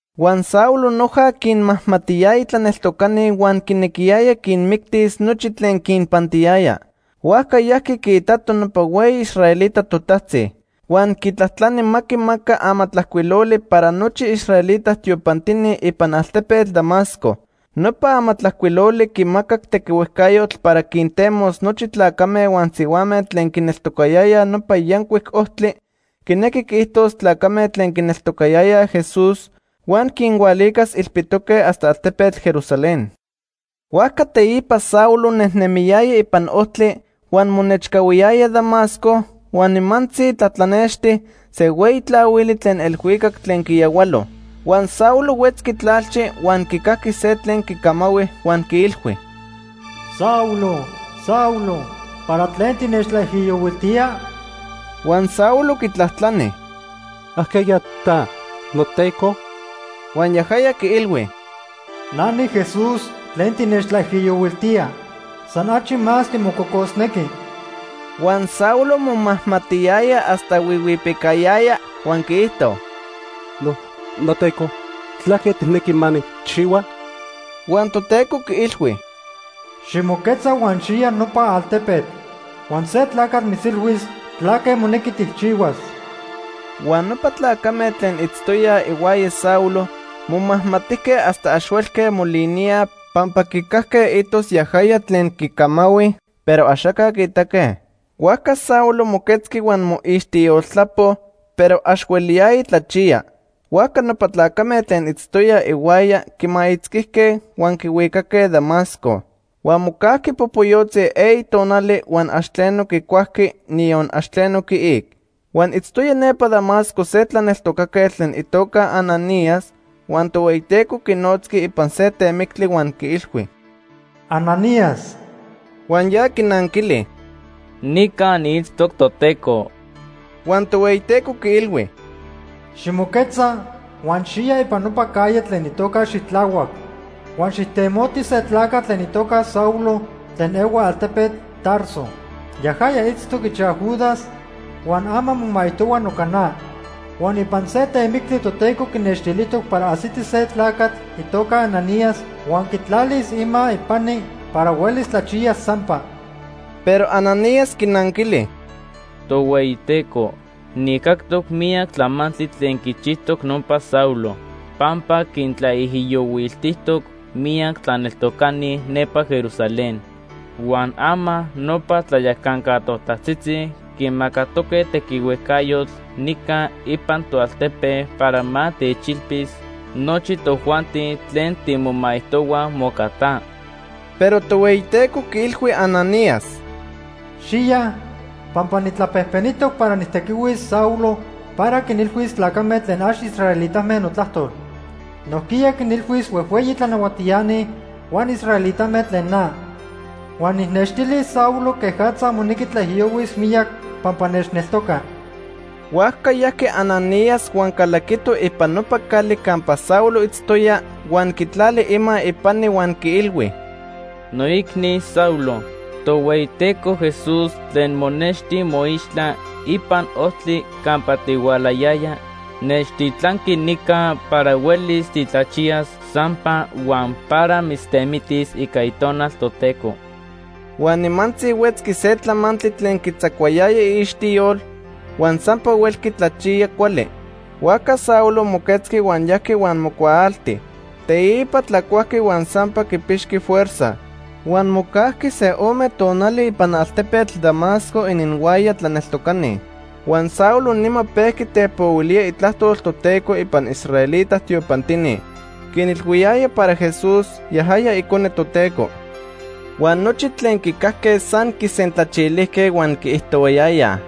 Huan Saulo noja quinmajmatiyaya tlaneltocani huan quinequiyaya quinmictis nochi tlen quinpantiyaya. Huajca yajqui quiitato nopa hueyi israelita totajtzi. Huan quitlajtlani ma quimaca amatlajcuiloli para nochi israelita tiopantini ipan altepetl Damasco. Nopa amatlajcuiloli quimacac tequihuejcayotl para quintemos nochi tlacame huan sihuame tlen quineltocayayaj Nopa Yancuic Ojtli, quinequi quiijtos tlacame tlen quineltocayayaj Jesús, huan quinhualicas ilpitoque hasta altepetl Jerusalén. Huajca teipa Saulo nejnemiyaya ipan ojtli huan monechcahuiyaya Damasco, huan nimantzi tlatlanexti se hueyi tlahuili tlen elhuicac tlen quiyahualo. Huan Saulo huetzqui tlalchi huan quicajqui se tlen quicamahui huan quiilhui: “Saulo, Saulo, ¿para tlen tinechtlaijiyohuiltía?” Huan Saulo quitlajtlani: “¿Ajqueya ta, noTeco?” Huan yajaya quiilhui: “Na niJesús tlen tinechtlaijiyohuiltía. San achi más timococosnequi.” Huan Saulo momajmatiyaya hasta huihuipicayaya huan quiijto: “NoTeco, ¿tlaque tijnequi ma nijchihua?” Huan Toteco quiilhui: “Ximoquetza huan xiya nopa altepetl. Huan se tlacatl mitzilhuis tlaque monequi tijchihuas.” Huan nopa tlacame tlen itztoyaj ihuaya Saulo momajmatijque hasta ax huelque moliníaj, pampa quicajque itos yajaya tlen quicamahui, pero axaca quiitaque. Huajca Saulo moquetzqui, huan moixtiyoltlapo, pero ax hueliyaya tlachiya. Huajca nopa tlacame tlen itztoyaj ihuaya quimaitzquijque huan quihuicaque Damasco. Huan mocajqui popoyotzi eyi tonali huan ax tleno quicuajqui, niyon ax tleno quiic. Huan itztoya nepa Damasco se tlaneltocaquetl tlen itoca Ananías. Huan Tohueyiteco quinotzqui ipan se temictli huan quiilhui: “Ananías.” Huan ya quinanquili: “Nica niitztoc, Toteco.” Huan Tohueyiteco quiilhui: “Ximoquetza huan xiya ipan nopa calle tlen itoca ‘Xitlahuac’. Huan xijtemoti se tlacatl tlen itoca Saulo tlen ehua altepetl Tarso. Yajaya itztoc ichaj Judas huan ama momaijtohua noca na. Huan ipan se temictli Toteco quinextilijtoc para ajsiti se tlacatl itoca Ananías huan quitlalis ima ipani para huelis tlachiyas sampa.” Pero Ananías quinanquili: “Tohueyiteco, nijcactoc miyac tlamantli tlen quichijtoc nopa Saulo, pampa quintlaijiyohuiltijtoc miyac tlaneltocani nepa Jerusalén. Huan ama nopa tlayacanca totajtzitzi quimacatoque tequihuejcayotl nica ipan toaltepe para ma techilpis nochi tojuanti tlen timomaijtohuaj moca ta.” Pero Tohueyiteco quiilhui Ananías: “Xiya, pampa nijtlapejpenijtoc para nijtequihuis Saulo para quinilhuis tlacame tlen ax israelitame notlajtol. Nojquiya quinilhuis huejhueyi tlanahuatiani huan israelitame tlen na. Huan nijnextilis Saulo quejatza monequi tlaijiyohuis miyac pampa nechneltoca.” Huajca yajqui Ananías huan calaquito ipan nopa cali campa Saulo itztoya, huan quitlali ima ipani huan quiilhui: ―Noicni Saulo, Tohueyiteco Jesús tlen monexti moixtla ipan ojtli campa tihualayaya, nechtitlanqui nica para huelis titlachiyas sampa huan para mitztemitis ica Itonal Toteco. Huan nimantzi huetzqui se tlamantli tlen quitzacuayaya iixtiyol, huan sampa huelqui tlachiya cuali. Huajca Saulo moquetzqui huan yajqui huan mocuaalti. Teipa tlacuajqui huan sampa quipixqui fuerza. Huan mocajqui se ome tonali ipan altepetl Damasco ininhuaya tlaneltocani. Huan Saulo nima pejqui tepohuilía Itlajtol Toteco ipan israelita tiopantini. Quinilhuiyaya para Jesús, yajaya Icone Toteco. Huan nochi tlen quicajque san quisentlachilijque huan quiijtohuayayaj: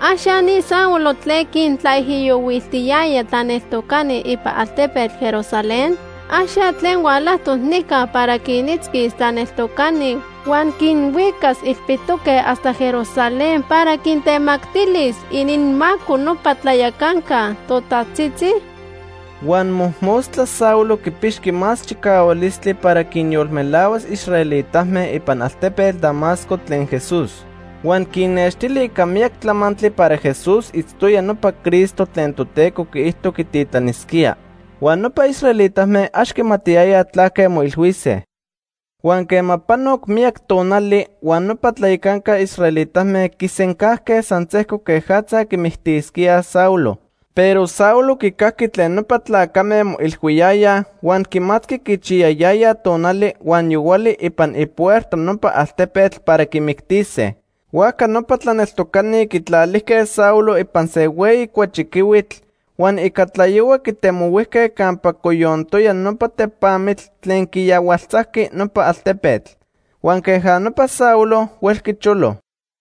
―¿Ax ya ni Saulo tlen quintlaijiyohuiltiyaya tlaneltocani ipan altepetl Jerusalén? ¿Ax ya tlen hualajtoc nica para quinitzquis tlaneltocani huan quinhuicas ilpitoque hasta Jerusalén para quintemactilis ininmaco nopa tlayacanca totajtzitzi? Huan mojmostla Saulo quipixqui más chicahualistli para quinyolmelahuas israelitame ipan altepetl Damasco tlen Jesús. Huan quinnextili ica miyac tlamantli para Jesús itztoya nopa Cristo tlen Toteco quiijto quititlanisquía. Huan nopa israelitame ax quimatiyayaj tlaque moilhuise. Huan quema panoc miyac tonali huan nopa tlayacanca israelitame quisencajque san sejco quejatza quimictisquíaj Saulo. Pero Saulo quicajqui tlen nopa tlacame moilhuiyayaj huan quimatqui quichiyayayaj tonali huan yohuali ipan ipuerta nopa altepetl para quimictise. Huajca nopa tlaneltocani quitlalijque Saulo ipan se hueyi cuachiquihuitl, huan ica tlayohua quitemohuijque campa coyontoya nopa tepamitl tlen quiyahualtzajqui nopa altepetl. Huan queja nopa Saulo huelqui cholo.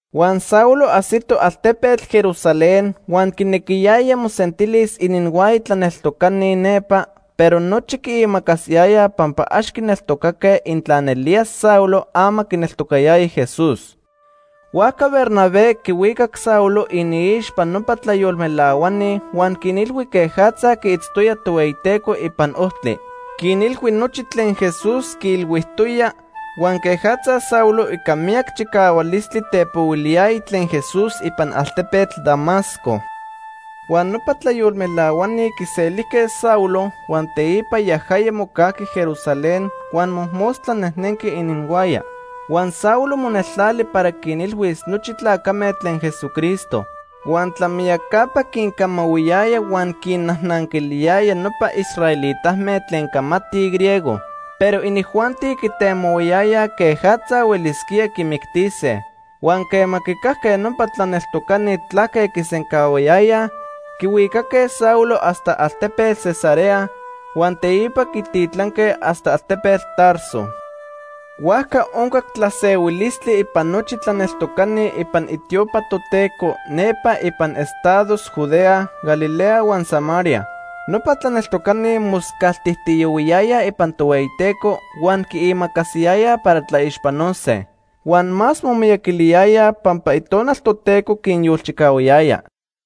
Huan Saulo ajsito altepetl Jerusalén huan quinequiyaya mosentilis ininhuaya tlaneltocani nepa, pero nochi quiimacasiyayaj pampa ax quineltocaque intla nelía Saulo ama quineltocatoya Jesús. Huajca Bernabé quihuicac Saulo iniixpa nopa tlayolmelahuani huan quinilhui quejatza quiitztoya Tohueyiteco ipan ojtli. Quinilhui nochi tlen Jesús quiilhuijtoya huan quejatza Saulo ica miyac chicahualistli tepohuiliyaya tlen Jesús ipan altepetl Damasco. Huan nopa tlayolmelahuani quiselijque Saulo, huan teipa yajaya mocajqui Jerusalén huan mojmostla nejnenqui ininhuaya. Huan Saulo moneltlali para quinilhuis nochi tlacame tlen Jesucristo. Huan tlamiyacapa quincamahuiyaya huan quinnajnanquiliyaya nopa israelitame tlen camatij griego; pero inijuanti quitemohuayayaj quejatza huelisquía quimictise. Huan quema quicajque nopa tlaneltocani tlaque quisencahuayayaj, quihuicaque Saulo hasta altepetl Cesarea, huan teipa quititlanque hasta altepetl Tarso. Huajca oncac tlasehuilistli ipan nochi tlaneltocani ipan itiopa Toteco nepa ipan estados Judea, Galilea huan Samaria. Nopa tlaneltocani moscaltijtiyohuiyayaj ipan Tohueyiteco huan quiimacasiyayaj para tlaixpanose. Huan más momiyaquiliyayaj pampa Itonal Toteco quinyolchicahuayaya.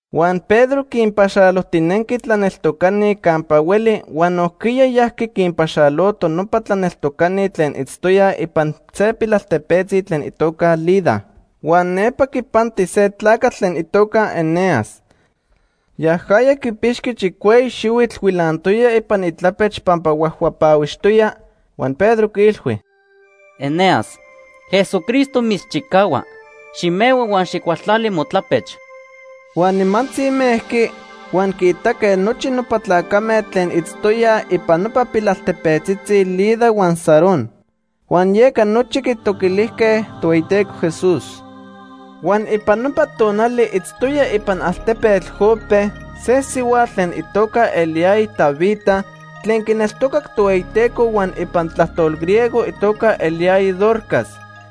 Huan Pedro quinpaxalojtinenqui tlaneltocani campa hueli huan nojquiya yajqui quinpaxaloto nopa tlaneltocani tlen itztoyaj ipan se pilaltepetzi tlen itoca Lida. Huan nepa quipanti se tlacatl tlen itoca Eneas. Yajaya quipixqui chicueyi xihuitl huilantoya ipan itlapech pampa huajhuapahuixtoya. Huan Pedro quiilhui: ―Eneas, Jesucristo mitzchicahua. Ximehua huan xijcualtlali motlapech. Huan nimantzi mejqui, huan quiitaque nochi nopa tlacame tlen itztoyaj ipan nopa pilaltepetzitzi Lida huan Sarón. Huan yeca nochi quitoquilijque Tohueyiteco Jesús. Huan ipan nopa tonali itztoya ipan altepetl Jope se sihuatl tlen itoca eliyaya Tabita tlen quineltocac Tohueyiteco huan ipan tlajtol griego itoca eliyaya Dorcas.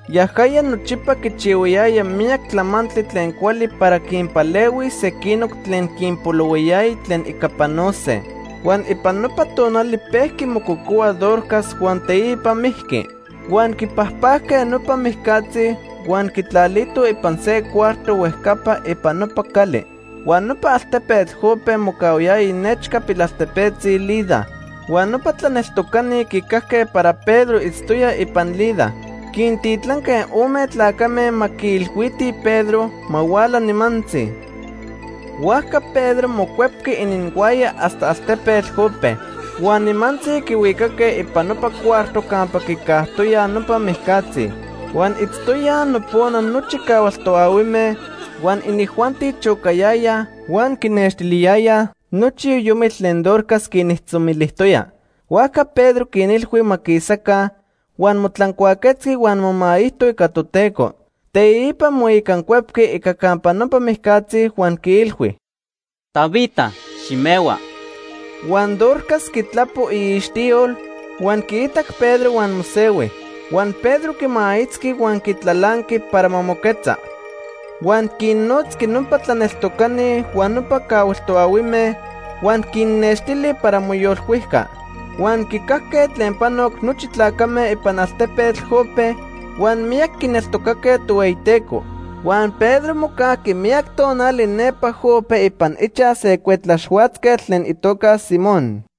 Yajaya nochipa quichihuayaya miyac tlamantli tlen cuali para quinpalehuis sequinoc tlen quinpolohuayaya tlen ica panose. Huan ipan nopa tonali pejqui mococohua Dorcas huan teipa mijqui. Huan quipajpajque nopa mijcatzi, huan quitlalitoj ipan se cuarto huejcapa ipan nopa cali. Huan nopa altepetl Jope mocahuayaya nechca pilaltepetzi Lida. Huan nopa tlaneltocani quicajque para Pedro itztoya ipan Lida. Quintitlanque ome tlacame ma quiilhuitij Pedro ma huala nimantzi. Huajca Pedro mocuepqui ininhuaya hasta altepetl Jope. Huan nimantzi quihuicaque ipan nopa cuarto campa quicajtoyaj nopa mijcatzi. Huan itztoyaj nopona nochi cahual toahuime, huan inijuanti chocayayaj huan quinextiliyayaj nochi yoyomitl tlen Dorcas quinijtzomilijtoya. Huajca Pedro quinilhui ma quisaca, huan motlancuaquetzqui huan momaijto ica Toteco. Teipa moicancuepqui ica campa nopa mijcatzi huan quiilhui: ―Tabita, ximehua. Huan Dorcas quitlapo iixtiyol, huan quiitac Pedro huan mosehui. Huan Pedro quimaitzqui huan quitlalanqui para ma moquetza. Huan quinnotzqui nopa tlaneltocani huan nopa cahual toahuime, huan quinnextili para moyolcuijca. Huan quicajque tlen panoc nochi tlacame ipan altepetl Jope, huan miyac quineltocaque Tohueyiteco. Huan Pedro mocajqui miyac tonali nepa Jope ipan ichaj se cuetlaxhuatzquetl tlen itoca Simón.